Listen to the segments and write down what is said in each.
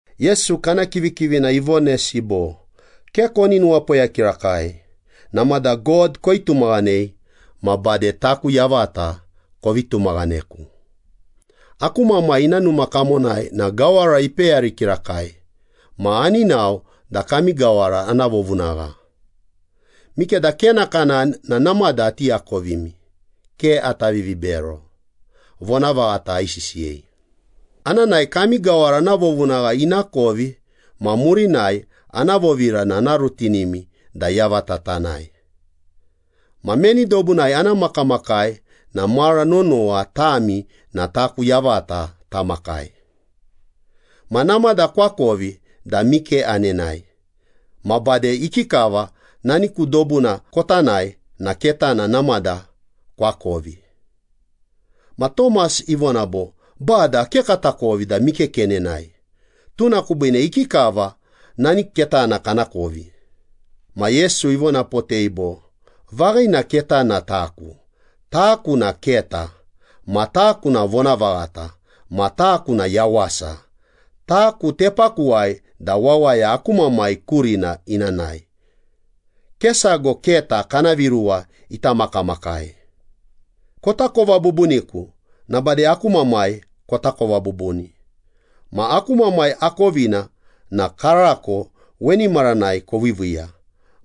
Yesu kana kivikivina ivonesi bo, “Ke koni nuwapoya kirakai. Namada God koitumaghanei ma bade taku yavata kovi tumaghaneku. Aku Mamai ina numa kamonai na gawara ipeyari kirakai, ma ani nao da kami gawara ana vovunagha. Mikeda ke nakanani na namada ati akovimi. Ke ata vivibero, vonavaghata aisisiyei. Ana nae, kami gawara ana vovunagha ina kovi ma murinai ana vovira na ana rutinimi da yavata tanae. Ma meni dobunai ana makamakai na mara nonowa tami na taku yavata tamakai. Ma namada koakovi da mike anenae, ma bade ikikava nani ku dobuna kota nae na ketana namada koakovi.” Ma Tomas ivona bo, “Bada, ke katakovi da mike kenenae, tuna kubiine ikikava nani ketana kanakovi?” Ma Yesu ivonapotei bo, “Vaghina ketana na taku. Taku na keta, ma taku na vonavaghata, ma taku na yawasa. Taku tepakuwai da wawaya aku Mamai kurina ina nae, ke sago keta kana viruwa ita makamakai. Kotakova bubuniku na bade aku Mamai kotakova bubuni. Ma aku Mamai akovina na karako weni maranai koviiviiya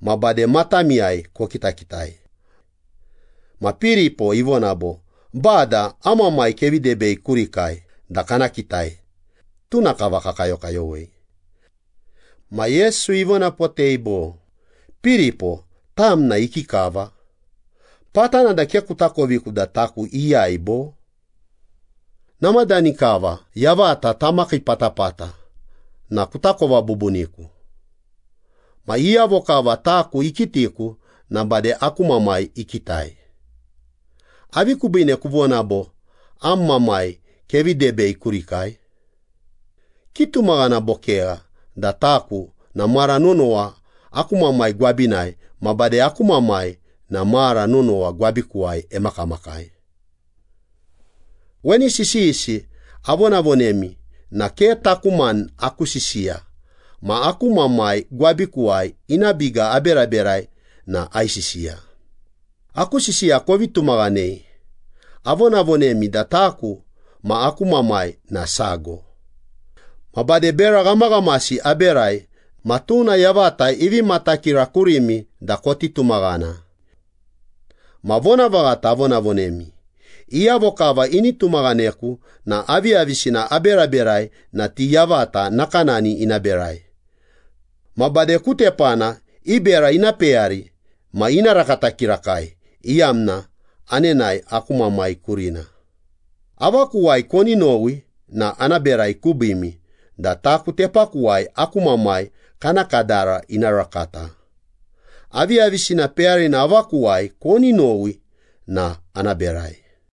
ma bade matamiyai kokitakitai.” Ma Piripo ivona bo, “Bada, am Mamai kevi debei kurikai da kana kitai. Tuna kava kakayokayowei.” Ma Yesu ivonapotei bo, “Piripo, tam na ikikava? Patana da ke kutakovi da taku iyai, bo? Namadani kava yavata tamakii patapata na kutakova bubuniku. Ma iyavo kava taku ikitiku na bade aku Mamai ikitai. Avi kubiine kuvona bo, ‘Am Mamai kevi debei kurikai?’ Kitumaghana bo kegha da taku na mara nonowa aku Mamai gwabinai, ma bade aku Mamai na mara nonowa gwabikuwai emakamakai. Weni sisiyisi avonavonemi na ke taku mani aku sisiya ma aku Mamai gwabikuwai ina biga eberaberai na aisisiya. Aku sisiya kovi tumaghanei, avonavonemi da taku ma aku Mamai na sago. Ma bade bera ghamaghamasi aberai na tuna yavata ivi matakira kurimi da koti tumaghana. Ma vonavaghata avonavonemi, iyavo kava ini tumaghaneku na aviyavisina aberaberai na ti yavata nakanani ina berai. Ma bade ku tepana i bera ina peyari ma ina rakata kirakai, iyamna anenae aku Mamai kurina. Avakuwai koni nowi na ana berai kubiimi da taku tepakuwai aku Mamai kana kadara ina rakata. Aviyavisina peyarina avakuwai koni nowi na ana berai.”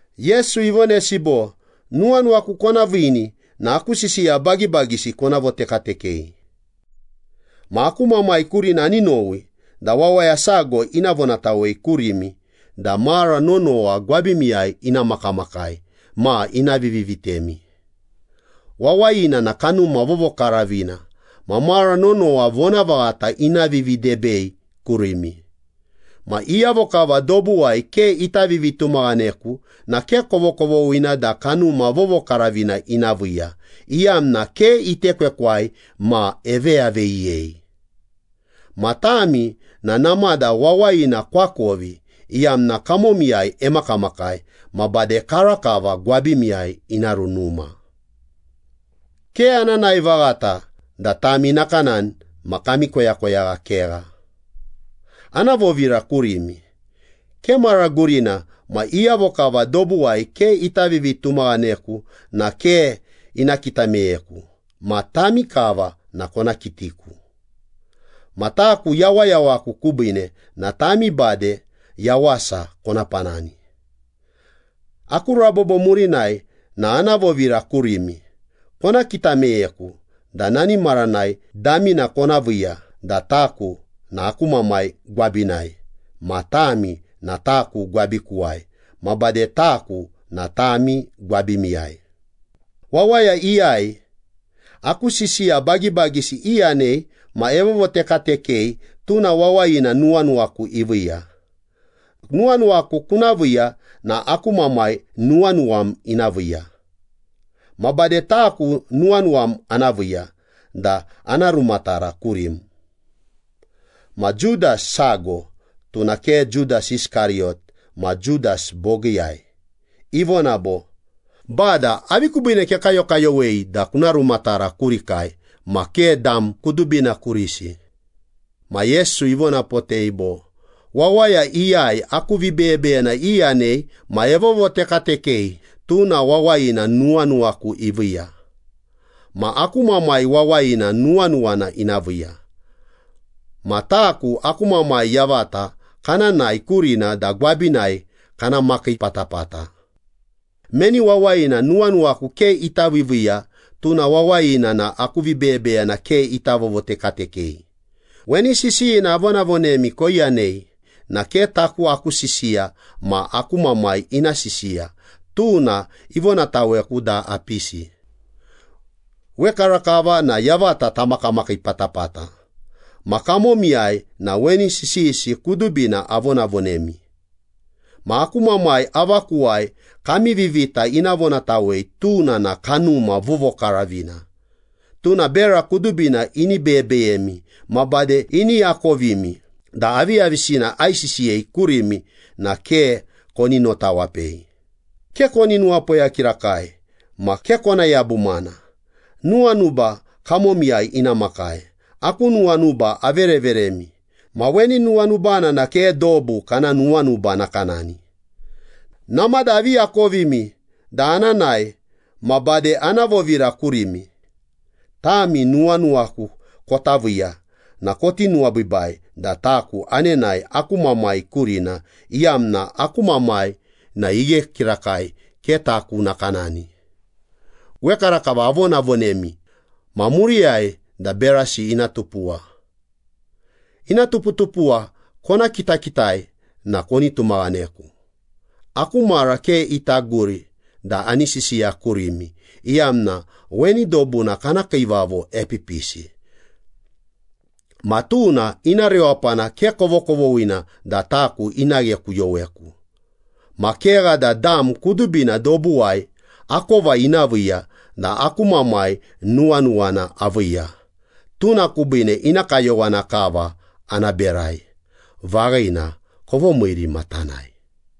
Yesu ivonesi bo, “Nuwanuwaku kona viini na aku sisiya bagibagisi kona votekatekei. Ma aku Mamai kurina ani nowi da wawaya sago ina vonatawei kurimi da mara nonowa gwabimiyai ina makamakai ma ina vivi vitemi. Wawayina na Kanuma Vovokaravina ma mara nonowa vonavaghata ina vividebei kurimi. Ma iyavo kava dobuwai ke ita vivitumaghaneku na ke kovokovoghina da Kanuma Vovokaravina ina viiya, iyamna ke itekwekwai ma eveyaveyiyei. Ma tami na namada wawayina koakovi iyamna kamomiyai emakamakai ma bade karakava gwabimiyai ina runuma.” “Ke ana nae vaghata da tami nakanani ma kami koyakoyagha kegha. Ana vovira kurimi. Ke mara gurina ma iyavo kava dobuwai ke ita vivitumaghaneku na ke ina kita meyeku. Ma tami kava na kona kitiku. Ma taku yawayawaku kubiine na tami bade yawasa kona panani. Aku rabobo murinai na ana vovira kurimi. Kona kita meyeku na nani maranai damina kona viiya da taku na aku Mamai gwabinai, ma tami na taku gwabikuwai, ma bade taku na tami gwabimiyai.” “Wawaya iyai aku sisiya bagibagisi iyanei ma evovotekatekei, tuna wawayina nuwanuwaku iviiya. Nuwanuwaku kuna viiya na aku Mamai nuwanuwam ina viiya. Ma bade taku nuwanuwam ana viiya da ana rumatara kurim.” Ma Judas sago (tuna ke Judas Iskariyot ma Judas bogiiyai) ivona bo, “Bada, avi kubiine kekayokayowei da kuna rumatara kurikai, ma ke dam kudubina kurisi?” Ma Yesu ivonapotei bo, “Wawaya iyai aku vibeyebeyena iyanei ma evovotekatekei, tuna wawayina nuwanuwaku iviiya. Ma aku Mamai wawayina nuwanuwana ina viiya. Ma taku aku Mamai yavata kana nae kurina da gwabinai kana makii patapata. Meni wawayina nuwanuwaku ke ita viiviiya, tuna wawayina na aku vibeyebeyena ke ita vovotekatekei. Weni sisiyina avonavonemi koiyanei na ke taku aku sisiya ma aku Mamai ina sisiya, tuna ivonataweku da apisi.” “Wekarakava na yavata tamakamakii patapata ma kamomiyai na weni sisiyisi kudubina avonavonemi. Ma aku Mamai avakuwai kami vivita ina vonatawei, tuna na Kanuma Vovokaravina. Tuna bera kudubina ini beyebeyemi, ma bade ini akovimi da aviyavisina aisisiyei kurimi na ke koni notawapei.” “Ke koni nuwapoya kirakai ma ke kona yabumana. Nuwanuba kamomiyai ina makai. Aku nuwanuba avereveremi. Ma weni nuwanubana na ke dobu kana nuwanuba nakanani. Namada avi akovimi ikovi da ana nae ma bade ana vovira kurimi. Tami nuwanuwaku kota viiya na koti nuwabiibai da taku anenae aku Mamai kurina, iyamna aku Mamai na ighe kirakai, ke taku nakanani. Wekarakava avonavonemi ma muriyai da berasi ina tupuwa. Ina tuputupuwa kona kitakitai na koni tumaghaneku. Aku mara ke ita guri da ani sisiya kurimi, iyamna weni dobuna kana kiivavo epipisi. Ma tuna ina rewapana ke kovokovoghina da taku ina ghekuyoweku. Ma kegha da dam kudubina dobuwai akova ina viiya da aku Mamai nuwanuwana aviiya, tuna kubiine ina kayowana kava ana berai.” “Vaghina, kovomiiri ma tanae.”